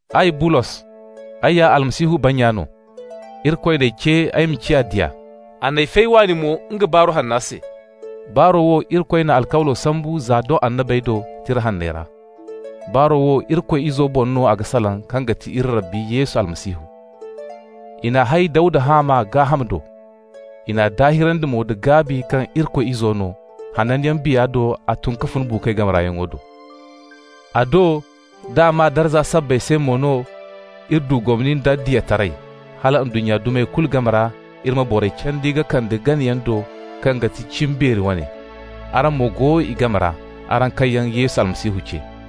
Ay Bulos, ay ya Yesu Almasihu bannya no. Irikoy n'ay ce ay ma ciya diya. A n'ay fay waani mo nga Baaru Hanna se. Baaro wo, Irikoy n'a alkawlo sambu za doŋ nga annabey do, Tira Hanney ra. Baaru Hanno wo Irikoy Izo boŋ no a ga salaŋ kaŋ ga ti iri Rabbi Yesu Almasihu. I n'a hay Dawda haama, gaaham do. I n'a daahirandi mo nda gaabi kaŋ Irikoy Izo no, hananyaŋ Biya do a tun ka fun buukoy game ra yaŋo do. A do d'a maa darza sabbay se mo no iri du gomni nda diyataray, hala ndunnya dumey kulu game ra iri ma borey candi ka kande ganayaŋ do kaŋ ga ti cimbeeri wane. Araŋ mo go i game ra, araŋ kaŋ yaŋ Yesu Almasihu ce.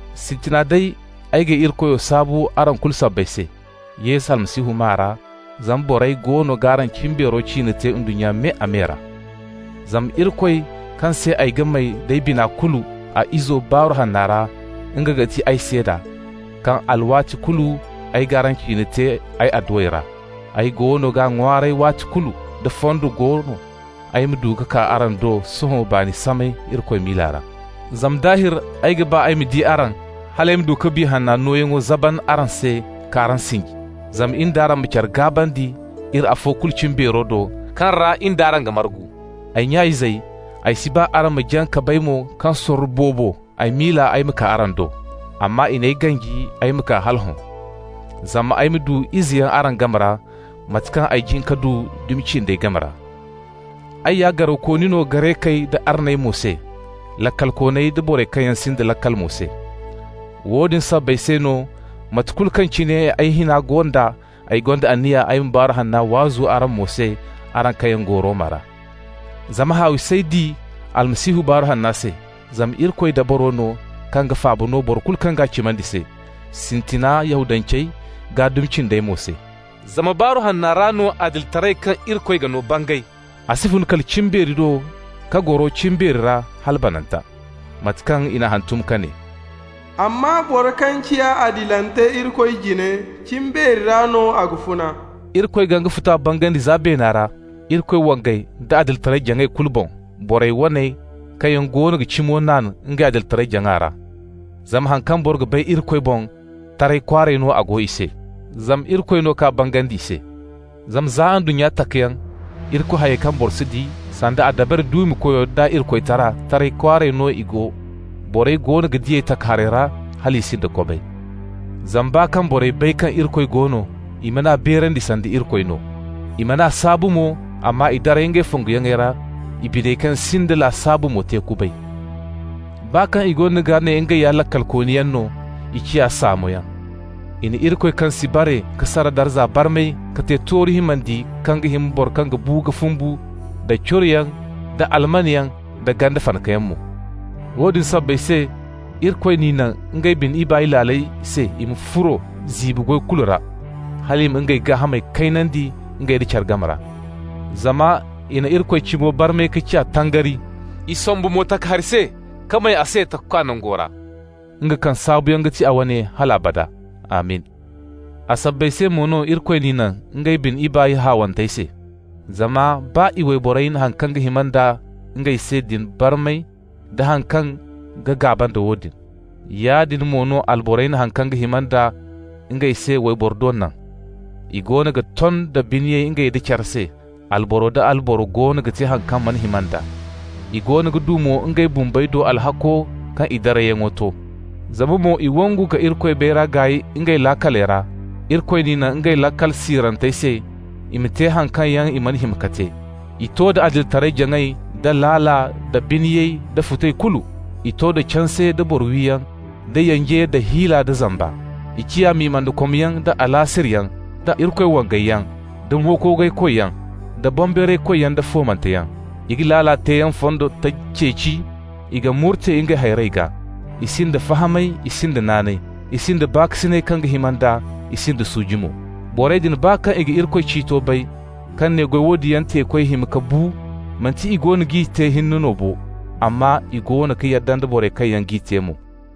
Sintina day, ay g'ay Irikoyo saabu araŋ kulu sabbay se, Yesu Almasihu maa ra, zama borey goono g'araŋ cimbeero ciine te ndunnya me-a-me ra. Zama Irikoy, kaŋ se ay ga may d'ay bina kulu a Izo Baaru Hanna ra, nga ga ti ay seeda, kaŋ alwaati kulu ay g'araŋ ciine te ay adduwey ra. Ay goono ga ŋwaaray waati kulu, da fondo go no, ay ma du ka kaa araŋ do sohõ baani samay Irikoy miila ra. Zama daahir ay ga ba ay ma di araŋ, hal ay ma du ka Biya Hanno nooyaŋ zaban araŋ se, k'araŋ sinji. Zama in d'araŋ ma care gaabandi, iri afo kulu cimbeero do, kaŋ ra in d'araŋ ga margu. Ay nya-izey, ay si ba araŋ ma jaŋ ka bay mo kaŋ sorro boobo ay miila ay ma kaa araŋ do (amma i n'ay ganji ay ma kaa hala hõ), zama ay ma du izeyaŋ araŋ game ra, mate kaŋ ay jin ka du dumi cindey game ra. Ay ya garawkooni no Garekey da arney mo se, laakalkooney da borey kaŋ yaŋ sinda laakal mo se. Woodin sabbay se no, mate kulu kaŋ cine ay hina go nd'a, ay gonda anniya ay ma Baaru Hanna waazu araŋ mo se, araŋ kaŋ yaŋ go Roma ra. Zama haawi s'ay di Almasihu Baaru Hanna se, zama Irikoy dabaro no kaŋ ga faaba no boro kulu kaŋ g'a cimandi se, sintina Yahudancey, gaa dumi cindey mo se. Zama Baaru Hanna ra no adilitaray kaŋ Irikoy ga no bangay. A si fun kala cimbeeri do ka goro cimbeeri ra hala bananta. Mate kaŋ i n'a hantum ka ne: «Amma boro kaŋ ciya adilante Irikoy jine, cimbeeri ra no a ga funa.» Irikoy ga nga futa bangandi za beena ra, Irikoy wangay da adilitaray-jaŋay kulu boŋ, borey waney, kaŋ yaŋ goono ga cimo naan ngey adilitaray-jaŋa ra. Zama haŋ kaŋ boro ga bay Irikoy boŋ, taray kwaaray no a go i se, zama Irikoy no k'a bangandi i se. Zama za ndunnya takayaŋ, Irikoy hayey kaŋ boro si di, sanda a dabari duumikoyo d'a Irikoytara, taray kwaaray no i go. Borey goono ga di ey takaharey ra, hal i sinda kobay. Zama baa kaŋ borey bay kaŋ Irikoy go no, i man'a beerandi sanda Irikoy no, i man'a saabu mo, amma i daray ngey fonguyaŋey ra, i biney kaŋ sinda laasabu mo te kubay. Baa kaŋ i goono ga ne ngey ya laakalkooniyaŋ no, i ciya saamoyaŋ. I na Irikoy kaŋ si bare ka sara darza barmay ka te tooru himandiyaŋ kaŋ ga hima boro kaŋ ga bu ka fumbu, da curoyaŋ, da almanyaŋ, da ganda fanakayaŋ mo. Woodin sabbay se Irikoy n'i naŋ ngey bine ibaay laaley se i ma furo ziibi goy kulu ra, hal i ma ngey gaahamey kaynandi ngey nda care game ra. Zama i na Irikoy cimo barmay ka ciya tangari, i sombu mo takahari se ka may a se Takakwa nango ra, nga kaŋ saabuyaŋ ga ti a wane hal abada. Amin! A sabbay se mo no Irikoy n'i naŋ ngey bine ibaay haawantey se. Zama baa i wayborey na haŋ kaŋ ga hima nda ngey se din barmay da haŋ kaŋ ga gaaba nda woodin. Yaadin mo no alborey na haŋ kaŋ ga hima nd'a ngey se wayboro do naŋ. I goono ga ton da biniyay ngey nda care se, alboro nda alboro goono ga te haŋ kaŋ mana hima nd'a. I goono ga du mo ngey bumbey do alhakko kaŋ i darayyaŋo to. Zama mo i wangu ka Irikoy bayray gaay ngey laakaley ra, Irikoy n'i naŋ ngey laakal siirantey se, i ma te haŋ kaŋ yaŋ i mana hima ka te. I to da adilitaray-jaŋay, da laala, da biniyay, da futay kulu. I to da canse, da boro wiyaŋ, da yanje, da hiila, da zamba. I ciya mimandakomyaŋ, da alaasirayyaŋ, da Irikoy wangayaŋ, da mo-koogay-koyyaŋ, da boŋbeeraykoyyaŋ, da foomanteyaŋ. I ga laala teeyaŋ fondo taji ceeci, i ga murte ngey hayrey gaa. I sinda fahamay, i sinda naanay, i sinda baakasinay kaŋ ga hima nd'a, i sinda suuji mo. Borey din, baa kaŋ i ga Irikoy ciito bay, kaŋ ne goy woodin yaŋ teekoy ga hima ka bu, manti i goono g'i te hinne no bo, amma i goono ga yadda nda borey kaŋ yaŋ g'i te mo.